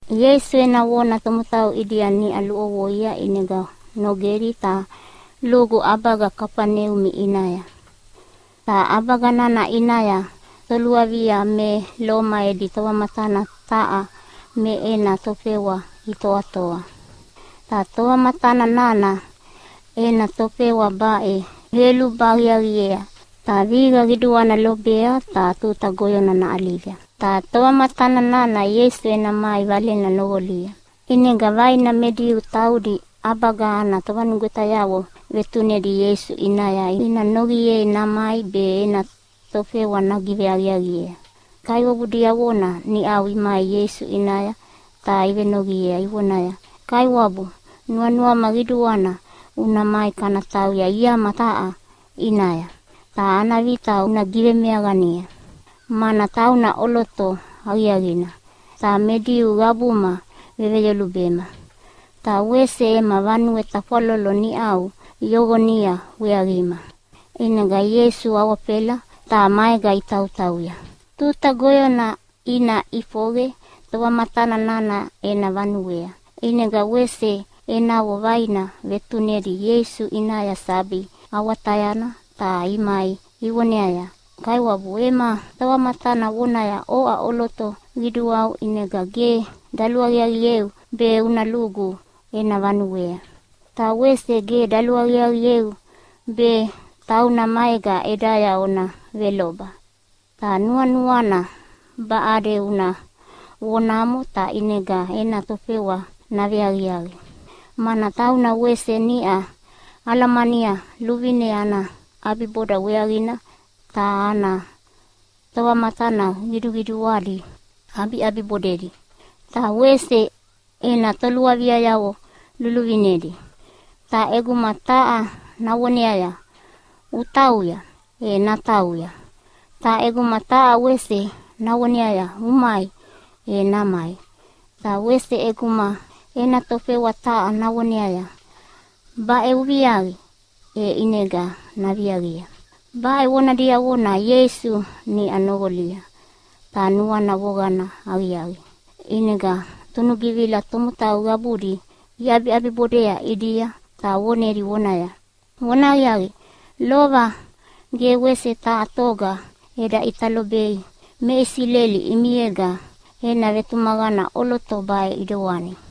Ieisu ena vona tomotau ʼidia niʼa luʼovoia ʼinega nogedi ta lugu ʼabaga Kafaneumi ʼinaya. Ta ʼabaga nana ʼinaya toluavia me Loma edi tovamatana taha me ena tofewa itoatoa. Tovamatana nana ena tofewa baʼe veyoluba aqiaqiea, ta vihiqa qiduana lobea be tuta goyona naʼaliga. Ta tovamatana nana Ieisu ena mai valena noqolia. ʼInega vaina me Diu taudi ʼabaga ana tovanugwetayavo vetunedi Ieisu ʼinaya ina noqiei namai be ena tofewa nagiveaqiaqiea. Ta kaiwabu diavona niʼau imai Ieisu ʼinaya ta ivenoqiea ivonaya, “Kaiwabu, nuanuama qiduana una mai kana tauya iama taha ʼinaya, ta ana vita una givemeaqania, mana tauna ʼoloto aqiaqina ta me Diu qabuma veveyolubema, ta wese ema vanue tafwalolo niʼau yoqonia weaqima.” ʼInega Ieisu awafela ta maega itautauya. Tuta goyona ina ʼifoqe tovamatana nana ena vanuea, ʼinega wese enavo vaina vetunedi Ieisu ʼinaya sabi awatayana ta imai ivoneaya, “Kaiwabu, ema tovamatana vonaya oʼa ʼoloto qiduau ʼinega ge daluaqiaqieu be una lugu ena vanuea. Ta wese ge daluaqiaqieu be tauna maega ʼedaya ona veloba. Ta nuanuana baʼade una vonamo ta ʼinega ena tofewa naveaqiaqi. Mana tauna wese niʼa alamania luvine ana ʼabiboda weaqina ta ana tovamatana qiduqiduadi ʼabiʼabibodedi. Ta wese ena toluaviayavo luluvinedi, ta ʼeguma taha navoneaya, ‘Utauya!’ e natauya, ta ʼeguma taha wese navoneaya, ‘Umai!’ e namai. Ta wese ʼeguma ena tofewa taha navoneaya, ‘Baʼe uviaqi!’ e ʼinega naviaqia.” Baʼe vona diavona Ieisu niʼa noqolia, ta nuana voqana aqiaqi, ʼinega tunugivila tomotau qabudi iʼabiʼabibodea ʼidia ta vonedi vonaya, “Vonahaqiaqi, lova ge wese taha toga eda ʼita lobei me Isileli ʼimiega ena vetumaqana ʼoloto baʼe ʼidewani!”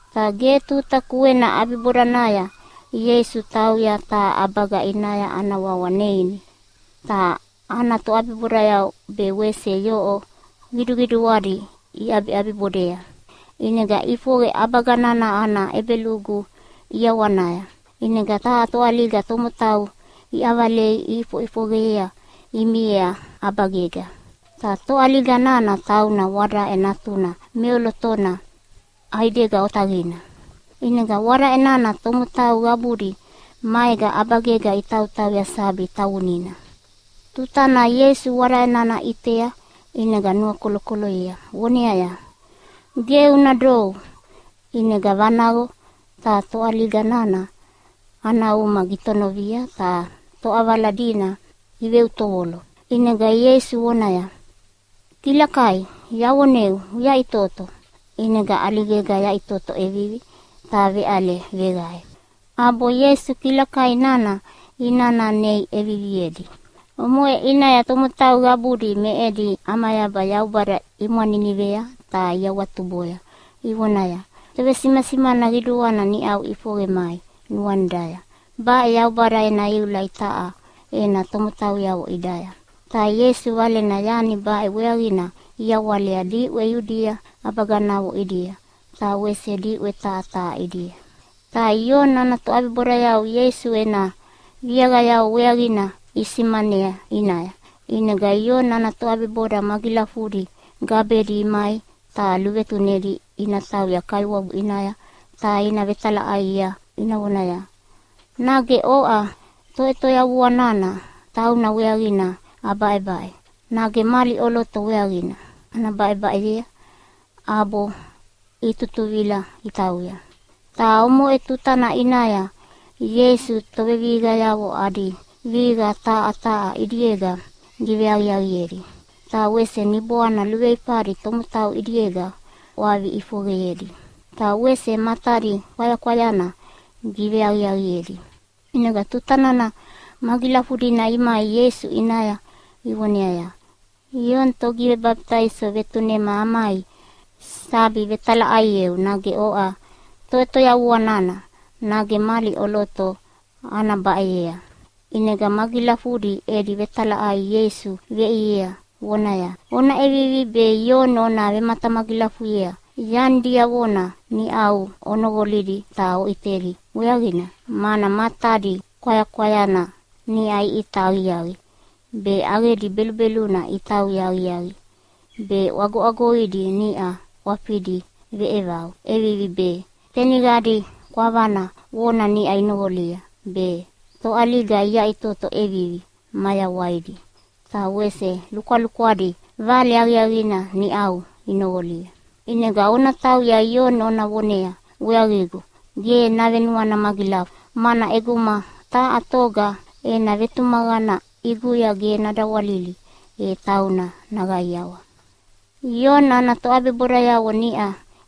Ta ge tuta kuena ʼabibodanaya Ieisu tauya taha ʼabaga ʼinaya ana wawa Neini. Ta ana toʼabibodayavo be wese yoʼo qiduadi iʼabibodea. ʼInega ʼifoqe ʼabaga nana ana ʼebelugu ʼiawanaya, ʼinega taha toʼaliga tomotau iʼavalei iʼifoʼifoqe miea ʼabagega. Ta toʼaliga nana tauna wadaʼe natuna meʼolotona ʼaidega otaqina. ʼInega wadaʼe nana tomotau qabudi maega ʼabagega itautauya sabi tavunina. Tutana Ieisu wadaʼe nana ʼitea ʼinega nuakolokoloyea voneaya, “Ge una dou.” ʼInega vanaqo ta toʼaliga nana ana uma gitonovia ta toʼavala dina iveutovolo. ʼInega Ieisu vonaya, “Kilakai, yavoneu uyaʼitoto!” ʼInega ʼaligega yaʼitoto ʼevivi ta veʼale veqae. ʼAbo Ieisu kilakai nana inana nei ʼeviviedi. Omoʼe ʼinaya tomotau qabudi me edi ʼamayaba Yaubada imwaninivea ta iawatuboya ivonaya, “Tovesimasimana qiduana niʼau ʼifoqe mai nuanidaya. Baʼe Yaubada ena iula itaʼa ena tomotauyavo ʼidaya.” Ta Ieisu Valena yani baʼe weaqina iyawalea diʼwe Iudia ʼabaganavo ʼidia, ta wese diʼwe taha taha ʼidia. Ta Ioni ana toʼabibodayavo Ieisu ena viaqayavo weaqina isimanea ʼinaya. ʼInega Ioni ana toʼabiboda magilafudi gabedi imai ta luvetunedi ina tauya Kaiwabu ʼinaya ta ina vetalaʼaiea ina vonaya, “Nage oʼa Toʼetoyavua nana tauna weaqina abaʼebaʼe, nage mali ʼoloto weaqina ana baʼebaʼeyea?” ʼAbo itutuvila itauya. Ta omoʼe tutana ʼinaya Ieisu tovevihiqayavo adi vihiqa taha taha ʼidiega giveaqiaqiedi, ta wese niboana luveifadi tomotau ʼidiega ʼwavi ʼifoqeyedi. Ta wese matadi kwayakwayana giveaqiaqiedi. ʼInega tuta nana magilafudina imai Ieisu ʼinaya ivoneaya, “Ioni Togivebabitaiso vetunema amai sabi vetalaʼaieu nage oʼa Toʼetoyavua nana, nage mali ʼoloto ana baʼeyea?” ʼInega magilafudi edi vetalaʼai Ieisu veʼiea vonaya, “Ona ʼevivi be Ioni ona vematamagilafuyea yani diavona niʼau onoqolidi ta oʼitedi weaqina, mana matadi kwayakwayana niʼa iʼita aqiaqi be, ʼaqedi belubeluna itauya aqiaqi be, ʼwagoʼwagoidi niʼa ʼwafidi veʼevau ʼevivi be, teniqadi kwavana vona niʼa inoqolia be, toʼaliga iyaʼitoto ʼevivi mayawaidi, ta wese lukwalukwadi vale aqiaqina niʼau inoqolia. ʼInega ona tauya Ioni ona vonea weaqigu ge navenuana magilafu, mana ʼeguma taha toga ena vetumaqana ʼiguya ge nadawalili e tauna naqaiawa.” Ioni ana toʼabibodayavo niʼa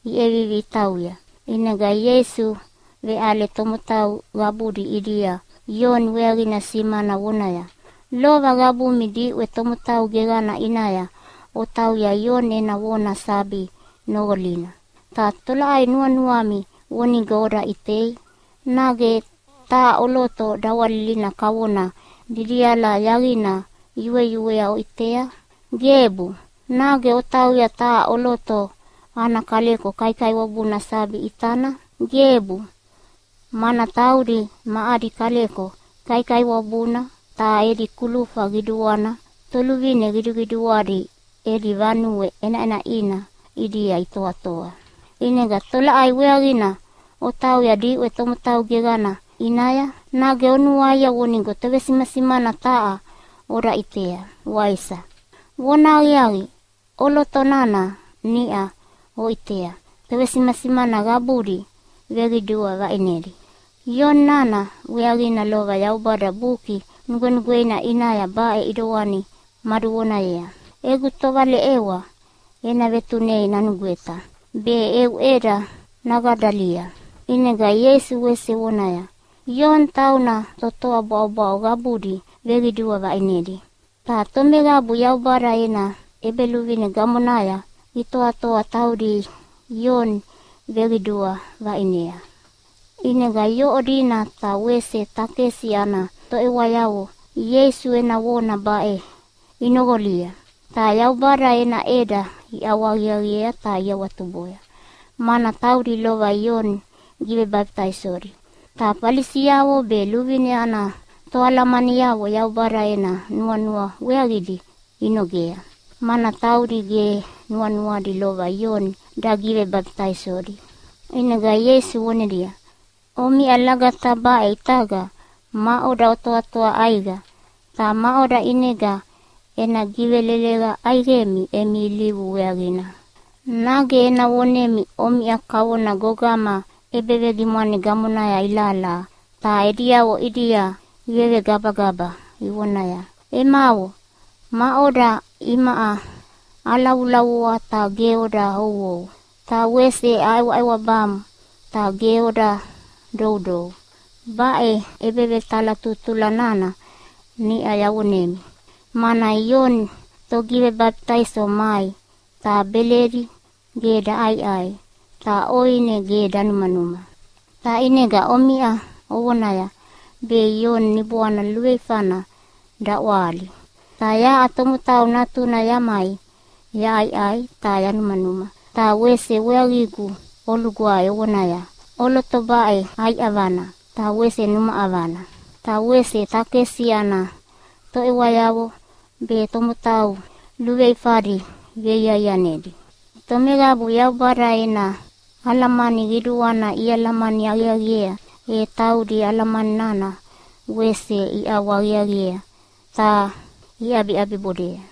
iʼevivi itauya, ʼinega Ieisu veʼale tomotau qabudi ʼidia Ioni weaqina simana vonaya, “Lova qabumi diʼwe tomotau geqana ʼinaya otauya Ioni ena vona sabi noqolina, ta tolaʼai nuanuami vonigo oda ʼitei? Nage taha ʼoloto dawalilina kavona didiala yaqina yueyuea oʼitea? Gebu! Nage otauya taha ʼoloto ana kaleko kaikaiwabuna sabi ʼitana? Gebu, mana taudi ma adi kaleko kaikaiwabuna ta edi kulufa qiduana toluvine qiduqiduadi edi vanue ʼenaʼenaʼina ʼidia itoatoa. ʼInega tolaʼai weaqina otauya diʼwe tomotau geqana ʼinaya? Nage onuaia vonigo tovesimasimana taha oda ʼitea, waisa? Vonahaqiaqi, ʼoloto nana niʼa oʼitea tovesimasimana qabudi veqidua vaʼinedi. Ioni nana weaqina lova Yaubada Buki Nugwenugweina ʼinaya baʼe ʼidewani maduvonayea, ‘Egu tovaleʼewa ena vetunei nanugweta, be eu ʼeda naqadalia.’” ʼInega Ieisu wese vonaya, “Ioni tauna totoa bwaʼobwaʼo qabudi veqidua vaʼinedi, ta tomeqabu Yaubada ena ʼEbeluvine gamonaya itoatoa taudi Ioni iveqidua vaʼinea.” ʼInega yoʼo dina ta wese takesi ana toʼewayavo Ieisu ena vona baʼe inoqolia ta Yaubada ena ʼeda iʼawahaqiaqiea ta iawatuboya, mana taudi lova Ioni givebabitaisodi. Ta Falisiavo be luvine ana toalamaniavo Yaubada ena nuanua weaqidi inogea, mana taudi ge nuanuadi lova Ioni dagivebabitaisodi. ʼInega Ieisu vonedia, “Omiʼa lagata baʼe ʼitaga maʼoda otoatoa ʼaiqa, ta maʼoda ʼinega ena giveleleqa ʼaiqemi emi ilivu weaqina? Nage ena vonemi omiʼa kavona gogama ʼebevegimwane gamonaya ilahalaha ta ediavo ʼidia ivegabagaba ivonaya, ‘Emavo maʼoda, imaʼa alavulavua ta ge oda ouou, ta wese aʼewaʼewabamu ta ge oda doudou.’ Baʼe ʼebevetalatutula nana niʼa yavonemi, mana Ioni Togivebabitaiso mai ta beledi ge daʼaiʼai ta ʼoine ge danumanuma. Ta ʼinega omiʼa ovonaya be Ioni niboana luveifana daʼwahali. Ta yaʼa Tomotau Natuna yamai yaʼaiʼai ta yanumanuma ta wese weaqigu olugwae ovonaya, ‘ʼOloto baʼe ʼai ʼavana ta wese numa ʼavana, ta wese takesi ana toʼewayavo be tomotau luveluveifadi veiaianedi.’ Tomeqabu Yaubada ena alamani qiduana ialamani aqiaqiea, e taudi alamani nana wese iʼawahaqiaqiea ta iʼabiʼabibodea.”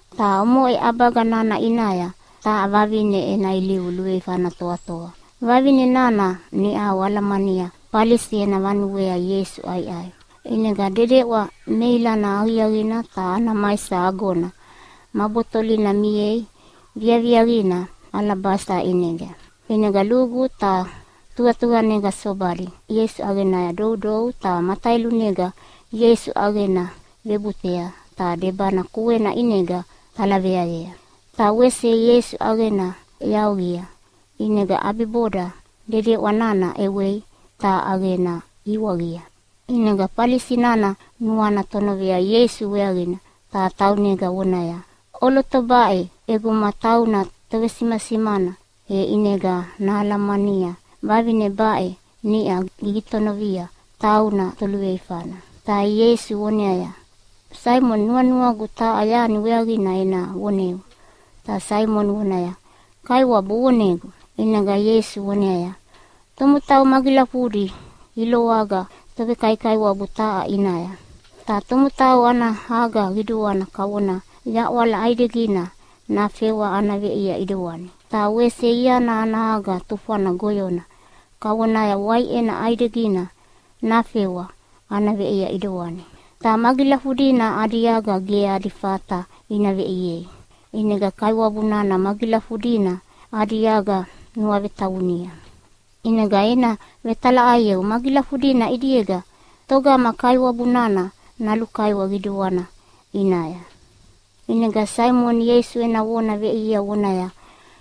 Ta omoʼe ʼabaga nana ʼinaya taha vavine ena ilivu luveifana toatoa. Vavine nana niʼau alamania Falisi ena vanuea Ieisu ʼaiʼai. ʼInega dedeʼwa meilana aqiaqina ta ana maisa agona ma botolina miea viaviaqina alabasita ʼinega. ʼInega lugu ta tuqatuqanega sobadi Ieisu ʼaqenaya doudou ta mataelunega Ieisu ʼaqena vebutea ta debana kuena ʼinega talaveayea, ta wese Ieisu ʼaqena yaoqia ʼinega ʼabiboda dedeʼwa nana ʼewei ta ʼaqena iwaqia. ʼInega Falisi nana nuana tonovea Ieisu weaqina ta taunega vonaya, “ʼOloto baʼe ʼeguma tauna tovesimasimana, e ʼinega nahalamania vavine baʼe niʼa gigitonovia tauna toluveifana.” Ta Ieisu voneaya, “Saimoni, nuanuagu taha yani weaqina ena voneu.” Ta Saimoni vonaya, “Kaiwabu, uvonegu.” ʼInega Ieisu voneaya, “Tomotau magilafudi iloaga tovekaikaiwabu taha ʼinaya. Taha tomotau ana aga qiduana kavona yaʼwala ʼaidegina nafewa ana veʼia ʼidewani. Ta wese iana ana aga tufwana goyona kavonaya waiʼena ʼaidegina nafewa ana veʼia ʼidewani. Ta magilafudina adi aga ge adi fata ina veʼiei, ʼinega kaiwabu nana magilafudina adi aga nuavetavunia. ʼInega ena vetalaʼaieu magilafudina ʼidiega togama kaiwabu nana nalukaiwa qiduana ʼinaya?” ʼInega Saimoni Ieisu ena vona veʼiea vonaya,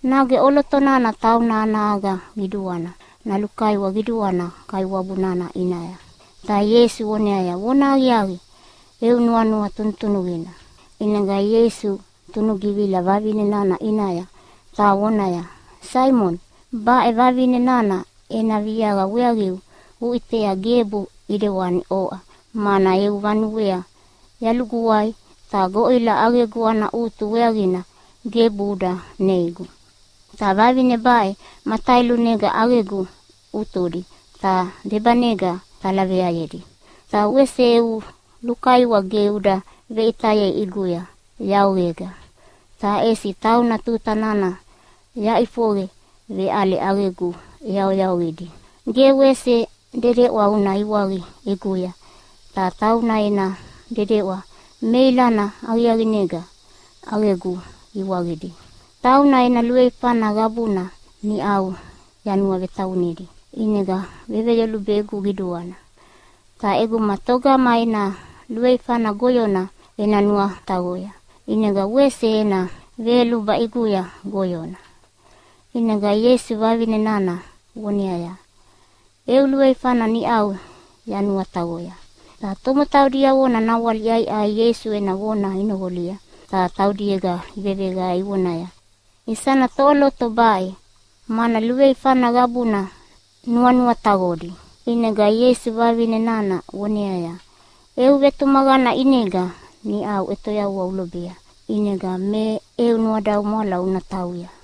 “Nage ʼoloto nana tauna ana aga qiduana nalukaiwa qiduana kaiwabu nana ʼinaya.” Ta Ieisu voneaya, “Vonahaqiaqi, eu nuanua tunutunuqina.” ʼInega Ieisu tunugivila vavine nana ʼinaya ta vonaya, “Saimoni, baʼe vavine nana ena viaqa weaqigu uʼitea gebu ʼidewani oʼa, mana eu vanuea yaluguwai ta goʼila ʼaqegu ana ʼutu weaqina gebu uda neigu. Ta vavine baʼe mataelunega ʼaqegu ʼutudi ta debanega talaveayedi. Ta wese eu lukaiwa ge uda veʼitayei ʼiguya yaoqega, ta ʼesi tauna tuta nana yaʼifoqe veʼale ʼaqegu ʼeyaoyaoqidi. Ge wese dedeʼwa uda iwaqia ʼiguya ta tauna ena dedeʼwa meilana aqiaqinega ʼaqegu iwaqidi. Tauna ena luveifana qabuna niʼau yanuavetavunidi, ʼinega veveyolubegu qiduana. Ta ʼeguma togama ena luveifana goyona ena nuataqoya, ʼinega wese ena veyoluba ʼiguya goyona.” ʼInega Ieisu vavine nana voneaya, “Eu luveifana niʼau yanuataqoya.” Ta tomotau diavona nawale iʼaiʼai Ieisu ena vona inoqolia ta taudiega iveveqae ivonaya, “Isana toʼoloto baʼe, mana luveifana qabuna nuanuataqodi?” ʼInega Ieisu vavine nana voneaya, “Eu vetumaqana ʼinega niʼau ʼetoyavua ulobea, ʼinega me eu nuadaumwala una tauya.”